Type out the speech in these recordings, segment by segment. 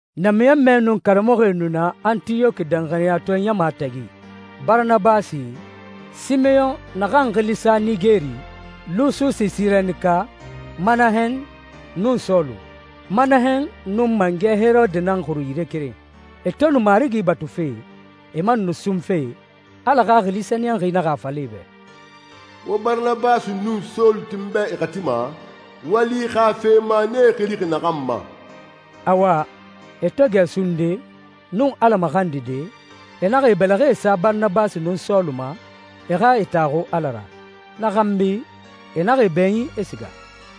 Namiɲɔnmɛe nun karamɔxɔe nu na Antiyɔki danxaniyatɔɛ ɲama tagi: Baranabasi, Simeyɔn naxan xili sa Nigeri, Lususi Sirenika, Manahɛn, nun Sɔlu. Manahɛn nun mangɛ Herode nan xuru yire keren. E to nu Marigi batufe, e man nu sunfe, Ala Xaxili Sɛniyɛnxi naxa a fala e bɛ, «Wo Baranabasi nun Sɔlu ti n bɛ e xati ma, wali xa fe ma n e xilixi naxan ma.» Awa, e to gɛ sunde, nun Ala maxandide, e naxa e bɛlɛxɛ sa Baranabasi nun Sɔlu ma, e xa e taxu Ala ra. Na xanbi, e naxa e bɛɲin, e siga.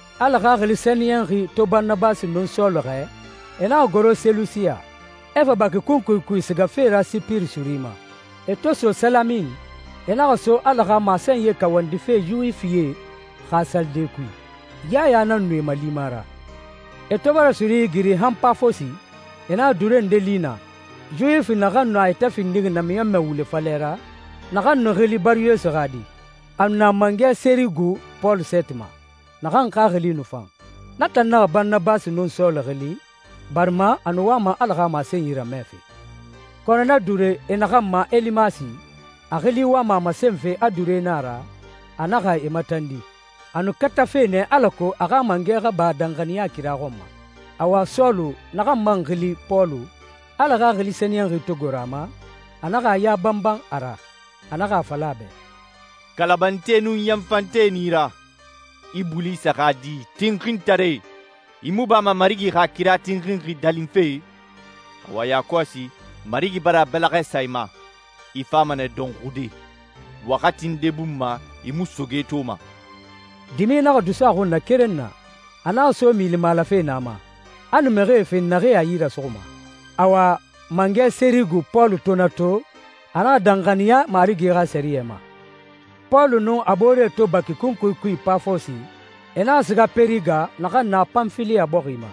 Ala Xaxili Sɛniyɛnxi to Baranabasi nun Sɔlu xɛɛ, e naxa goro Selusiya, e fa baki kunkui kui sigafe ra Sipiri suri ma. E to so Salamin, e naxa so Ala xa masenyi kawandife Yuwifie xa salide kui. Yaya nan nu e malima ra. E to bara suri igiri han Pafosi, e naxa duure nde li naa, Yuwifi naxan nu a yɛtɛ findixi namiɲɔnmɛ wule falɛ ra, naxan nu xili Bari Yesu xa di. A nu na mangɛ Sɛrigu Pɔlu sɛɛti ma, naxan xaxili nu fan. Na tan naxa Baranabasi nun Sɔlu xili, barima a nu wama Ala xa masenyi ramɛfe. Kɔnɔ na duure e naxan ma Elimasi, a xili wama a masenfe a duure nan a ra, a naxa e matandi. A nu katafe nɛ alako a xa mangɛ xa ba danxaniya kira xɔn ma. Awa Sɔlu, naxan man xili Pɔlu, Ala Xaxili Sɛniyɛnxi to goro a ma, a naxa a ya banban a ra, a naxa a fala a bɛ, «Kalabante nun yanfante nan i ra. Ibulisa xa di, tinxintare, i mu bama Marigi xa kira tinxinxi dalinfe? Awa yakɔsi, Marigi bara a bɛlɛxɛ sa i ma. I fama nɛ dɔnxude. Waxati nde bun ma, i mu soge toma.» Dimi naxa dusu a xun na keren na. A naxa so milimalafe na ma, a nu mixie fen naxee a yi rasuxuma. Awa, mangɛ Sɛrigu Pɔlu to na to, a naxa danxaniya Marigi xa sɛriyɛ ma. Pɔlu nun a booree to baki kunkui kui Pafosi, e naxa siga Pɛriga naxan na Panfiliya bɔxi ma.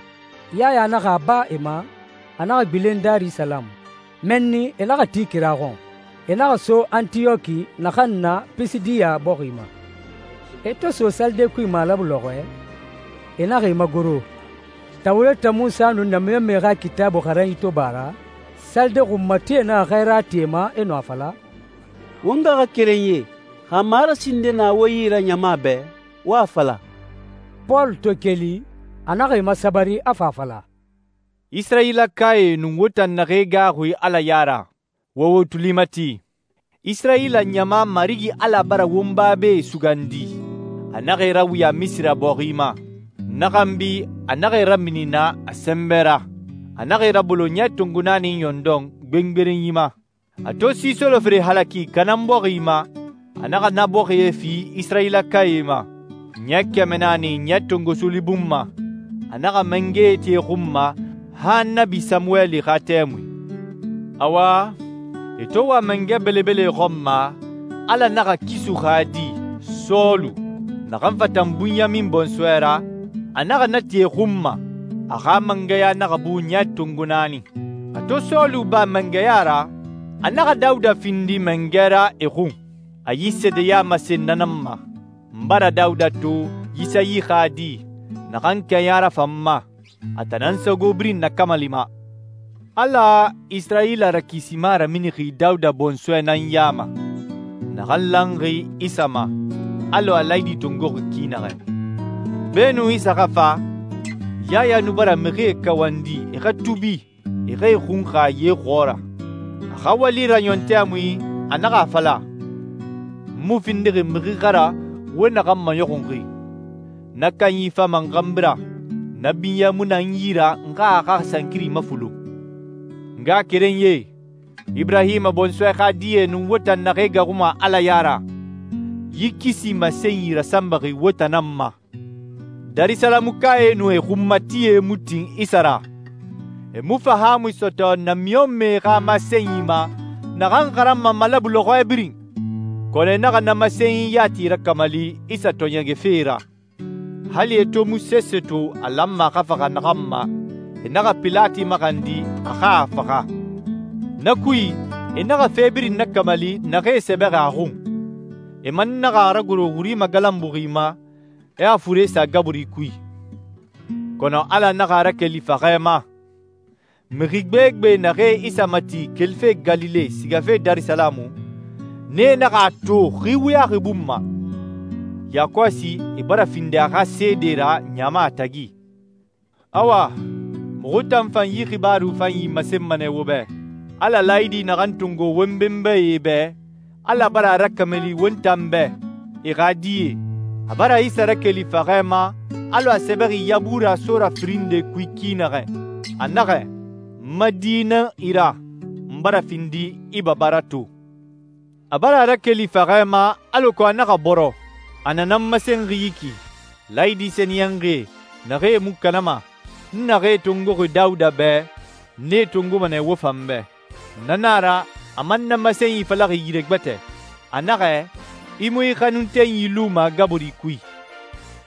Yaya naxa a ba e ma, a naxa gbilen Darisalamu. Mɛnni e naxa ti kira xɔn. E naxa so Antiyɔki naxan na Pisidiya bɔxi ma. E to so salide kui malabu lɔxɔɛ, e naxa e magoro. Tawureta Munsa nun namiɲɔnmɛe xa Kitaabui xaranyi to ba a ra, salide xunmatie naxa xɛɛra ti e ma, e nu a fala, «Won ngaxakerenyie, xa marasi nde na wo yi ra ɲama bɛ, wo a fala.» Pɔlu to keli, a naxa e masabari, a fa a fala, «Isirayilakae nun wo tan naxee gaaxuxi Ala ya ra, wo wo tuli mati. Isirayila ɲama Marigi Ala bara won babae sugandi. A naxa e rawuya Misira bɔxi ma. Na xanbi a naxa e ramini naa a sɛnbɛ ra. A naxa e rabalo ɲɛ tongo naani ɲɔndɔn gbengberenyi ma. A to si solofere halaki Kanaan bɔxi ma, a naxa na bɔxie fi Isirayilakae ma. Ɲɛ kɛmɛ naani ɲɛ tongo suuli bun ma, a naxa mangɛe ti e xun ma han Annabi Samuweli xa tɛmui. Awa, e to wa mangɛ belebele xɔn ma, Ala naxa Kisu xa di, Sɔlu, naxan fatan Bunyamin bɔnsɔɛ ra, a naxa na ti e xun ma. A xa mangɛya naxa bu ɲɛ tongo naani. A to Sɔlu ba mangɛya ra, a naxa Dawuda findi mangɛ ra e xun. A yi seedeya masen na nan ma, ‹N bara Dawuda to, Yisayi xa di, naxan kɛɲa rafan n ma. A tan nan n sago birin nakamalima.›» «Ala Isirayila Rakisima raminixi Dawuda bɔnsɔɛ nan ya ma, naxan lanxi Isa ma, alɔ a laayidi tongoxi ki naxɛ. Beenun Isa xa fa, Yaya nu bara mixie kawandi e xa tuubi, e xa e xunxa ye xɔɔra. A xa wali raɲɔn tɛmui, a naxa a fala, ‹N mu findixi mixi xa ra, wo naxan maɲɔxunxi. Na kanyi fama n xanbi ra. Na binyɛ mu na n yi ra n xa a xa sankiri mafulun.›» «N ngaxakerenyie, Iburahima bɔnsɔɛ xa die nun wo tan naxee gaaxuma Ala ya ra, yi kisi masenyi rasanbaxi won tan nan ma. Darisalamukae nun e xunmatie mu tin Isa ra. E mu fahaamui sɔtɔ namiɲɔnmɛe xa masenyi ma, naxan xaranma malabu lɔxɔɛ birin. Kɔnɔ e naxa na masenyi yati rakamali Isa tɔɔɲɛgɛfe ra. Hali e to mu sese to a lanma a xa faxa naxan ma, e naxa Pilati maxandi a xa a faxa. Na kui, e naxa fe birin nakamali naxee sɛbɛxi a xun. E man naxa a ragoro wuri magalanbuxi ma, e a fure sa gaburi kui. Kɔnɔ Ala naxa a rakeli faxɛ ma. Mixi gbegbe naxee Isa mati kelife Galile sigafe Darisalamu, nee naxa a to xi wuyaxi bun ma. Yakɔsi e bara findi a xa seedee ra ɲama tagi.» «Awa, muxu tan fan yi xibaaru fanyi masenma nɛ wo bɛ, Ala laayidi naxan tongo won benbae bɛ. Ala bara a rakamali won tan bɛ, e xa die. A bara Isa rakeli faxɛ ma alɔ a sɛbɛxi Yabura sora firin nde kui ki naxɛ. A naxɛ, ‹N ma di nan i ra. N bara findi i baba ra to.› A bara a rakeli faxɛ ma, alako a naxa bɔrɔ. A na nan masenxi yi ki, ‹Laayidi sɛniyɛnxie, naxee mu kanama, n naxee tongoxi Dawuda bɛ, n nee tongoma nɛ wo fan bɛ.› Na na a ra, a man na masenyi falaxi yire gbɛtɛ. A naxɛ, ‹I mu i xanuntenyi luma gaburi kui.›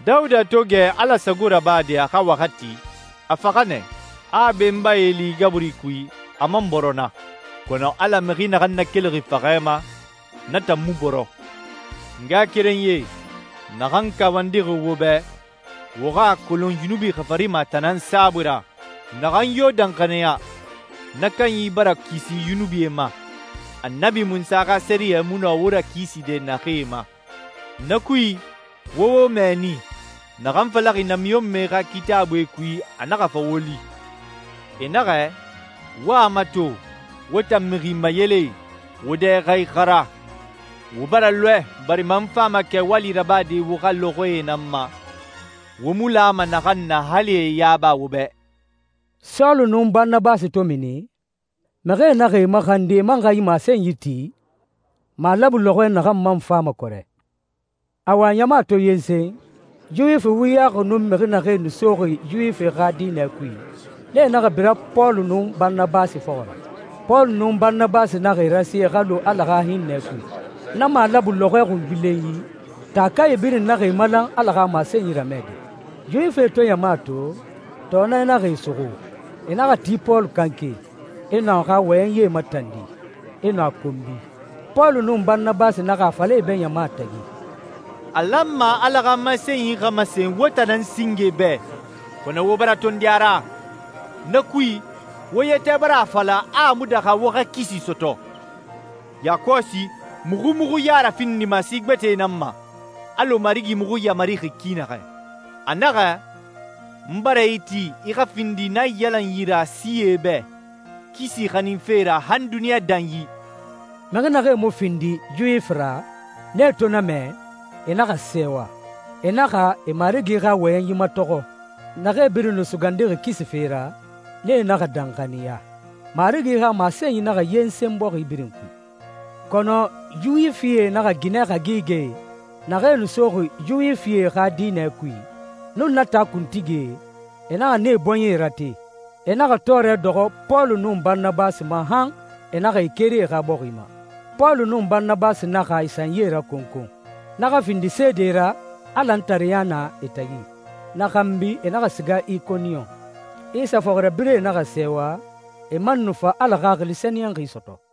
Dawuda to gɛ Ala sago rabade a xa waxati, a faxa nɛ, a a benbae li gaburi kui, a man bɔrɔ naa. Kɔnɔ Ala mixi naxan nakelixi faxɛ ma, na tan mu bɔrɔ.» «N ngaxakerenyie, naxan kawandixi wo bɛ, wo xa a kolon yunubi xafarima a tan nan saabui ra. Naxan yo danxaniya, na kanyi bara kisi yunubie ma, Annabi Munsa xa sɛriyɛ mu nɔ wo rakiside naxee ma. Na kui, wo wo mɛɛni naxan falaxi namiɲɔnmɛe xa Kitaabuie kui, a naxa fa wo li. E naxɛ, ‹Wo a mato, wo tan mixi mayelee, wo dɛ xa ixara, wo bara lɔɛ, barima n fama kɛwali rabade wo xa lɔxɔɛe nan ma, wo mu lama naxan na hali e a yaba wo bɛ.›» Sɔlu nun Baranabasi to mini, mixie naxa e maxandi e man xa yi masenyi ti malabu lɔxɔɛ naxan man fama kɔrɛ. Awa, ɲama to yensen, Yuwifi wuyaxi nun mixi naxee nu soxi Yuwifi xa diinɛ kui, nee naxa bira Pɔlu nun Baranabasi fɔxɔ ra. Pɔlu nun Baranabasi naxa e rasi e xa lu Ala xa hinnɛ kui. Na malabu lɔxɔɛ xungbilenyi, taakae birin naxa e malan Ala xa masenyi ramɛde. Yuwifie to ɲama to, tɔɔnɛ naxa e suxu. E naxa ti Pɔlu kanke, e nu a xa wɔyɛnyi matandi, e nu a konbi. Pɔlu nun Baranabasi naxa a fala e bɛ ɲama tagi, «A lanma Ala xa masenyi xa masen wo tan nan singe bɛ, kɔnɔ wo bara tondi a ra. Na kui, wo yɛtɛ bara a fala a mu daxa wo xa kisi sɔtɔ. Yakɔsi muxu muxu ya rafindima si gbɛtɛe nan ma, alɔ Marigi muxu yamarixi ki naxɛ. A naxɛ, ‹N bara i ti i xa findi naiyalanyi ra sie bɛ, kisi xaninfe ra han duniɲa danyi.›» Mixi naxee mu findixi Yuwifi ra, nee to na mɛ, e naxa sɛɛwa. E naxa e Marigi xa wɔyɛnyi matɔxɔ. Naxee birin nu sugandixi kisi fe ra, nee naxa danxaniya. Marigi xa masenyi naxa yensen bɔxi birin kui. Kɔnɔ Yuwifie naxa ginɛ hagigɛe, naxee nu soxi Yuwifie xa diinɛ kui, nun na taa kuntigie, e naxa nee bɔɲɛe rate. E naxa tɔɔrɛ dɔxɔ Pɔlu nun Baranabasi ma han e naxa e keri e xa bɔxi ma. Pɔlu nun Baranabasi naxa e sanyi rakonkon, na xa findi seede ra a lantareya na e tagi. Na xanbi e naxa siga Ikoniyon. Isa fɔxirabirɛe naxa sɛɛwa, e man nu fa Ala Xaxili Sɛniyɛnxi sɔtɔ.